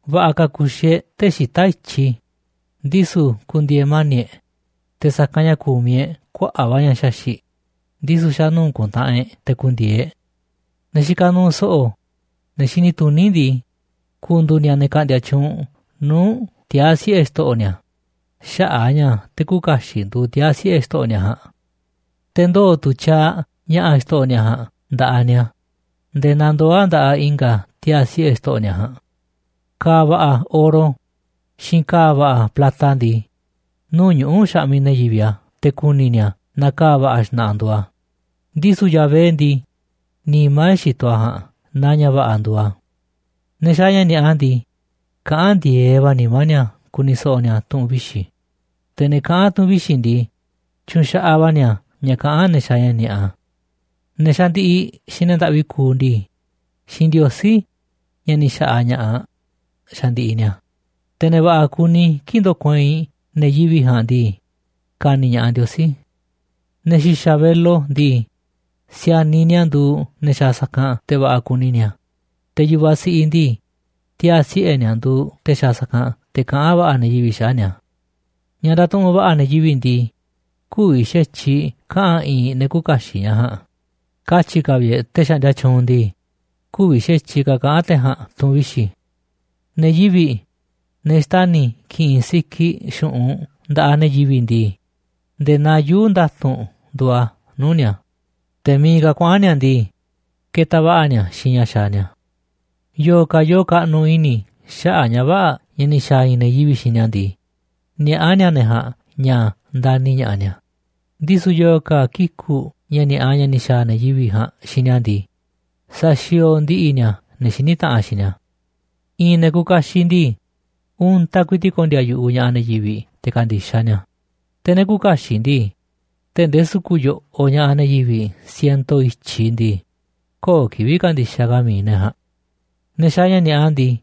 Va̱ꞌa̱ ka̱ ku̱xi̱ e̱ꞌ tee̱ꞌ xita̱ꞌ i̱tyiꞌ, ndisu̱ ku̱ndi̱e̱e̱ mani̱ꞌ e̱ꞌ, te̱ sa̱kanꞌ ña̱ ku̱miꞌ e̱ꞌ kuaꞌa̱ꞌ va̱ ña̱ xaxi̱ꞌ, ndisu̱ xa̱ nuu̱ꞌ ku̱ntaꞌanꞌ e̱ꞌ te̱ ku̱ndi̱e̱e̱ e̱ꞌ. Ne̱ xikaꞌ nuuꞌ so̱ꞌo̱, ne̱ xini tuní ndii, ku̱ndu̱u̱ ni̱a̱ ne̱ ka̱ꞌndi̱a̱ tyuunꞌ nuu̱ꞌ tiaa̱ siꞌe̱ xto̱ꞌo̱ ni̱a̱ xaꞌa̱ꞌ a̱ ña̱ te̱ küuꞌ kaxiꞌ nduuꞌ tiaa̱ siꞌe̱ xto̱ꞌo̱ ni̱a̱ ja̱a̱nꞌ. Te̱ ndoo̱ tu̱ tyaaꞌ ña̱ꞌa̱ xto̱ꞌo̱ ni̱a̱ ja̱a̱nꞌ nda̱ꞌaꞌ ni̱a̱ nde̱e̱ naa ndoo̱ a̱ nda̱ꞌaꞌ i̱nga̱ tiaa̱ siꞌe̱ xto̱ꞌo̱ ni̱a̱ ja̱a̱nꞌ. Ka̱a̱ va̱ꞌa̱ oro xiinꞌ ka̱a̱ va̱ꞌa̱ plata ndii, nuu̱ꞌ ñuꞌu̱ xaꞌmiꞌ ne̱ yivi̱ꞌ a̱ te̱ ku̱ni̱ ni̱a̱ naaꞌ ka̱a̱ va̱ꞌa̱ xna̱ꞌa̱ nduuꞌ a̱, ndisu̱ Yahvé ndii, nimá e̱ꞌ xitoꞌ a̱ ja̱a̱nꞌ naaꞌ ña̱ va̱ꞌa̱ nduuꞌ a̱. Ne̱ xaaꞌ ña̱ ni̱a̱ꞌa ndii, kaꞌán ndi̱e̱eꞌ va̱ nimá ni̱a̱ ku̱ni̱ so̱ꞌo̱ ni̱a̱ tu̱ꞌu̱n vixi̱, te̱ ne̱ kaꞌán tu̱ꞌu̱n vixi̱ ndii, tyuunꞌ xaꞌaꞌ va̱ ni̱a̱ ña̱ kaꞌán ne̱ xaaꞌ ña̱ ni̱a̱ꞌa. Ne̱ xandiꞌiꞌ xiinꞌ ne̱ ndaꞌvi kuuꞌ ndii, xiinꞌ Ndiosí, ña̱ ni̱ xa̱ꞌa̱ ña̱ꞌaꞌ, xandiꞌiꞌ ni̱a̱, te̱ ne̱ va̱ꞌa̱ kuni kii̱ꞌ ndokueinꞌ ne̱ yivi̱ꞌ ja̱a̱nꞌ ndii, ka̱ni̱ ña̱ꞌaꞌ Ndiosí. Ne̱ xi̱xa̱ velo ndii, si̱a̱niꞌ ni̱a̱ nduuꞌ ne̱ xaaꞌ sa̱kanꞌ te̱ va̱ꞌa̱ kuni ni̱a̱, te̱ yu̱vaꞌ siꞌiꞌ ndii, tiaa̱ siꞌe̱ ni̱a̱ nduuꞌ te̱ xaaꞌ sa̱kanꞌ te̱ kaꞌán va̱ꞌa̱ ne̱ yivi̱ꞌ xaꞌa̱ꞌ ni̱a̱. Ña̱ ndatuꞌunꞌ va̱ꞌa̱ ne̱ yivi̱ꞌ ndii, kü̱vi̱ xa̱tyiꞌ kaꞌa̱n i̱i̱n ne̱ küuꞌ kaxiꞌ ña̱ ja̱a̱nꞌ, katyi̱ ka̱ vi̱ꞌ e̱ꞌ te̱ xaꞌndia tyuunꞌ ndii, kü̱vi̱ xa̱tyiꞌ ka̱ kaꞌa̱n te̱ ja̱a̱nꞌ tu̱ꞌu̱n vixi̱. Ne̱ yivi̱ꞌ, ne̱ xtani̱ ki̱ꞌi̱n sikiꞌ xu̱ꞌunꞌ nda̱ꞌaꞌ ne̱ yivi̱ꞌ ndii, nde̱e̱ naa yuu̱ꞌ nda̱tu̱nꞌ nduuꞌ a̱ nuu̱ꞌ ni̱a̱, te̱ miiꞌ ka̱ kuaꞌa̱n ni̱a̱ ndii, ketaꞌ va̱ꞌa̱ ni̱a̱ xiinꞌ ña̱ xaaꞌ ni̱a̱. Yo̱o̱ ka̱ yoo kaꞌnuꞌ i̱ni̱ xaꞌa̱ꞌ ña̱ vä̱ꞌa̱ ña̱ ni̱ xa̱a̱ i̱i̱n ne̱ yivi̱ꞌ xiinꞌ ni̱a̱ ndii, niaꞌá ni̱a̱ ne̱ ja̱a̱nꞌ ña̱ ndani̱ ña̱ꞌaꞌ ni̱a̱, ndisu̱ yo̱o̱ ka̱ kiku̱ꞌ ña̱ ni̱a̱ꞌa ña̱ ni̱ xa̱a̱ ne̱ yivi̱ꞌ ja̱a̱nꞌ xiinꞌ ni̱a̱ ndii, saxiooꞌ ndi̱ꞌi̱ ni̱a̱ ne̱ xiní taꞌanꞌ xiinꞌ ni̱a̱. I̱i̱n ne̱ kuuꞌ kaxiꞌ ndii, untaꞌ ku̱i̱ti̱ꞌ ko̱ndi̱a̱ yu̱ꞌuꞌ ña̱ꞌaꞌ ne̱ yivi̱ꞌ te̱ ka̱ndi̱xaꞌ ni̱a̱, te̱ ne̱ küuꞌ kaxiꞌ ndii, tee̱ꞌ ndee su̱ku̱ꞌ yo̱ꞌoꞌ ña̱ꞌaꞌ ne̱ yivi̱ꞌ siento i̱tyiꞌ ndii, köo̱ꞌ kivi̱ꞌ ka̱ndi̱xaꞌ ka̱ mi̱iꞌ ne̱ ja̱a̱nꞌ. Ne̱ xaaꞌ ña̱ ni̱a̱ꞌa ndii,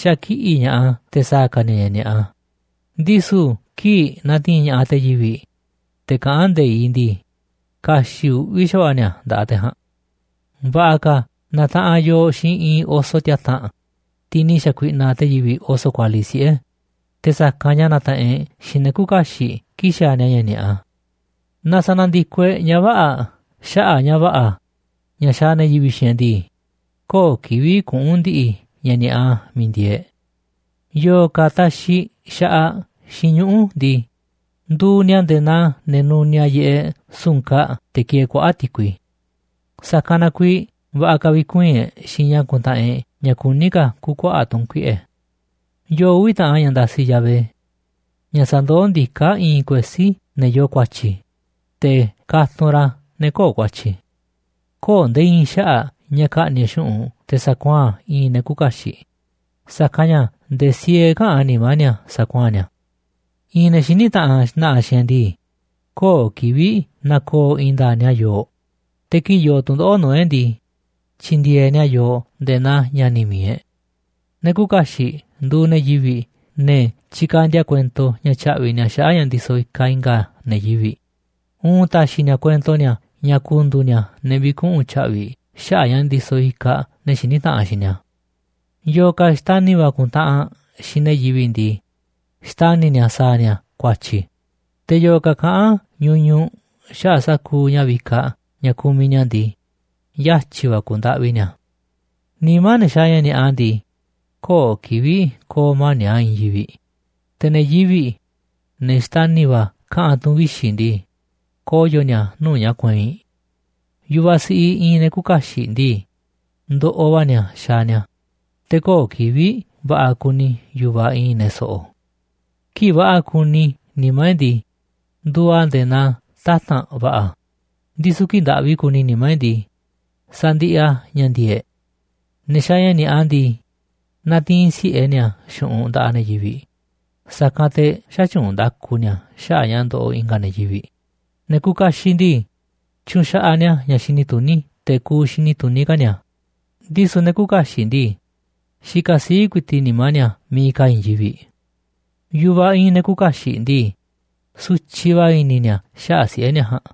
xakiꞌi̱ꞌ ña̱ꞌaꞌ a̱ te̱ sa̱a̱ ka̱ ni̱a̱ ña̱ ni̱a̱ꞌa, ndisu̱ kii̱ꞌ na̱ti̱i̱n ña̱ꞌaꞌ te̱ yivi̱ꞌ, te̱ kaꞌán nde̱iꞌ ndii, ka̱xi̱ꞌ uꞌvi̱ xa̱va̱ꞌa̱ ni̱a̱ nda̱ꞌaꞌ te̱ ja̱a̱nꞌ. Va̱ꞌa̱ ka̱ na̱taꞌanꞌ yooꞌ xiinꞌ i̱i̱n oso tiata̱nꞌ, tiꞌ ni̱ xa̱kuiꞌnaꞌ te̱ yivi̱ꞌ oso kualiꞌ siꞌe̱, te̱ sa̱kanꞌ ña̱ na̱taꞌanꞌ e̱ꞌ xiinꞌ ne̱ küuꞌ kaxiꞌ kii̱ꞌ xaaꞌ ni̱a̱ ña̱ ni̱a̱ꞌa. Naaꞌ sa̱na̱ndiko e̱ꞌ ña̱ vä̱ꞌa̱ xaꞌa̱ꞌ ña̱ va̱ꞌa̱ ña̱ xaaꞌ ne̱ yivi̱ꞌ xiinꞌ e̱ꞌ ndii, köo̱ꞌ kivi̱ꞌ kuꞌu̱n ndi̱ꞌi̱ ña̱ ni̱a̱ꞌa miiꞌ ndieeꞌ e̱ꞌ. Yo̱o̱ ka̱ taxiꞌ xaꞌaꞌ xiinꞌ ñuꞌu̱ ndii, nduuꞌ ni̱a̱ nde̱e̱ naa ne̱ nuniaꞌ yiꞌeꞌ su̱nkaꞌ te̱ ki̱e̱e̱ kuaꞌa̱ꞌ ti̱kui. Sa̱kanꞌ na kuiiꞌ va̱ꞌa̱ ka̱ vi̱kuii̱n e̱ꞌ xiinꞌ ña̱ kuntaꞌanꞌ e̱ꞌ ña̱ kuní ka̱ ku̱u̱ kuaꞌa̱ꞌ tu̱nkuiꞌe̱. Yoo uvi̱ taꞌan ña̱ ndasiꞌ Yahvé, ña̱ sandoó ndiká i̱i̱n kuesí ne̱ yoo ku̱a̱tyi̱, te̱ katunꞌ ra̱ ne̱ köo̱ꞌ ku̱a̱tyi̱. Köo̱ꞌ nde̱e̱ i̱i̱n xaꞌa̱ꞌ ña̱ ka̱ꞌni̱ꞌ e̱ꞌ xu̱ꞌunꞌ te̱ sa̱kuaa̱n i̱i̱n ne̱ küuꞌ kaxiꞌ, sa̱kanꞌ ña̱ nde̱e̱ siee käꞌán nimá ni̱a̱ sa̱kuaa̱n ni̱a̱. I̱i̱n ne̱ xiní taꞌanꞌ xna̱ꞌa̱ xiinꞌ e̱ꞌ ndii, köo̱ꞌ kivi̱ꞌ na̱ko̱o̱ i̱i̱n nda̱a̱ꞌ ni̱a̱ yooꞌ, te̱ kii̱ꞌ yoo tu̱ndoꞌo̱ꞌ nuu̱ꞌ e̱ꞌ ndii, tyindieeꞌ ni̱a̱ yooꞌ nde̱e̱ naa ña̱ni̱ mi̱iꞌ e̱ꞌ. Ne̱ küuꞌ kaxiꞌ nduuꞌ ne̱ yivi̱ꞌ, ne̱ tyikandia kuento ña̱ tya̱ꞌvi̱ ni̱a̱ xaꞌa̱ꞌ ña̱ ndisoꞌ ikaꞌ i̱nga̱ ne̱ yivi̱ꞌ, uun ta̱xi̱ ni̱a̱ kuento ni̱a̱ ña̱ ku̱ndu̱u̱ ni̱a̱ ne̱ vi̱kuꞌu̱n tya̱ꞌvi̱ xaꞌa̱ꞌ ña̱ ndisoꞌ ikaꞌ ne̱ xiní taꞌanꞌ xiinꞌ ni̱a̱. Yo̱o̱ ka̱ xtani̱ va̱ kuntaꞌanꞌ xiinꞌ ne̱ yivi̱ꞌ ndii, xtani̱ ni̱a̱ sa̱a̱ ni̱a̱ ku̱a̱tyi̱, te̱ yo̱o̱ ka̱ kaꞌán ñuñuꞌ xaꞌa̱ꞌ sa̱kuuꞌ ña̱ vikaꞌ ña̱ kumiꞌ ni̱a̱ ndii, yatyi̱ va̱ ku̱u̱ ndaꞌvi ni̱a̱. Nimá ne̱ xaaꞌ ña̱ ni̱a̱ꞌa ndii, köo̱ꞌ kivi̱ꞌ ko̱o̱ mani̱ꞌ a̱ i̱i̱n yivi̱ꞌ, te̱ ne̱ yivi̱ꞌ, ne̱ xtani̱ va̱ kaꞌa̱n tu̱ꞌu̱n vixi̱ ndii, koyo̱ ni̱a̱ nuu̱ꞌ ña̱ kueinꞌ. Yu̱vaꞌ siꞌiꞌ i̱i̱n ne̱ küuꞌ kaxiꞌ ndii, ndoꞌoꞌ va̱ ni̱a̱ xaaꞌ ni̱a̱, te̱ köo̱ꞌ kivi̱ꞌ va̱ꞌa̱ kuni yu̱vaꞌ i̱i̱n ne̱ so̱ꞌo̱. Kii̱ꞌ va̱ꞌa̱ kuni nimá e̱ꞌ ndii, nduuꞌ a̱ nde̱e̱ naa tata̱nꞌ va̱ꞌa̱, ndisu̱ kii̱ꞌ ndaꞌvi kuni nimá e̱ꞌ ndii, sandiꞌiꞌ a̱ ña̱ ndi̱e̱e̱ꞌ e̱ꞌ. Ne̱ xaaꞌ ña̱ ni̱a̱ꞌa ndii, natiinꞌ si̱ꞌe ni̱a̱ xu̱ꞌunꞌ nda̱ꞌaꞌ ne̱ yivi̱ꞌ, sa̱kanꞌ te̱ xätyuunꞌ nda̱ku ni̱a̱ xaꞌa̱ꞌ ña̱ ndoꞌoꞌ i̱nga̱ ne̱ yivi̱ꞌ. Ne̱ kuuꞌ kaxiꞌ ndii, tyunxaꞌaꞌ ni̱a̱ ña̱ xini tuní te̱ ku̱u̱ xini tuní ka̱ ni̱a̱, ndisu̱ ne̱ küuꞌ kaxiꞌ ndii, xikaꞌ sii̱ꞌ ku̱i̱ti̱ꞌ nimá ni̱a̱ miiꞌ ka̱ i̱i̱n yivi̱ꞌ. Yu̱vaꞌ i̱i̱n ne̱ küuꞌ kaxiꞌ ndii, sutyiꞌ va̱ i̱ni̱ ni̱a̱ xaꞌa̱ꞌ siꞌe̱ ni̱a̱ ja̱a̱nꞌ,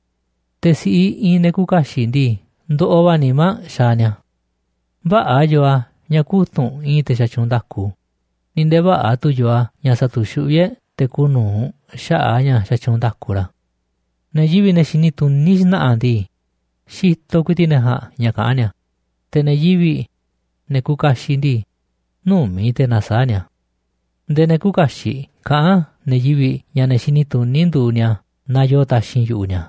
te̱ si̱ꞌiꞌ i̱i̱n ne̱ küuꞌ kaxiꞌ ndii, ndoꞌoꞌ va̱ nimá aꞌ xaaꞌ ni̱a̱. Vä̱ꞌa̱ yoo a̱ ña̱ kutu̱nꞌ i̱i̱n te̱ xatyuunꞌ nda̱ku, ni̱ nde̱e̱ vä̱ꞌa̱ tu̱ yoo a̱ ña̱ sa̱tu̱xuꞌví e̱ꞌ te̱ kuuꞌ nu̱uꞌ xaꞌa̱ꞌ a̱ ña̱ xatyuunꞌ nda̱ku ra̱. Ne̱ yivi̱ꞌ, ne̱ xini tuní xna̱ꞌa̱ ndii, xitoꞌ ku̱i̱ti̱ꞌ ne̱ ja̱a̱nꞌ ña̱ kaꞌán ni̱a̱, te̱ ne̱ yivi̱ꞌ, ne̱ kuuꞌ kaxiꞌ ndii, nümi̱ꞌ te̱ nasaáꞌ ni̱a̱. Nde̱e̱ ne̱ küuꞌ kaxiꞌ kaꞌán ne̱ yivi̱ꞌ ña̱ ne̱ xini tuní nduuꞌ ni̱a̱ naaꞌ yoo taxi̱nꞌ yu̱ꞌuꞌ ni̱a̱,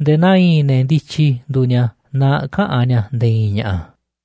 nde̱e̱ naa i̱i̱n ne̱ ndityi nduuꞌ ni̱a̱ naaꞌ käꞌán ni̱a̱ nde̱e̱ i̱i̱n ña̱ꞌa̱.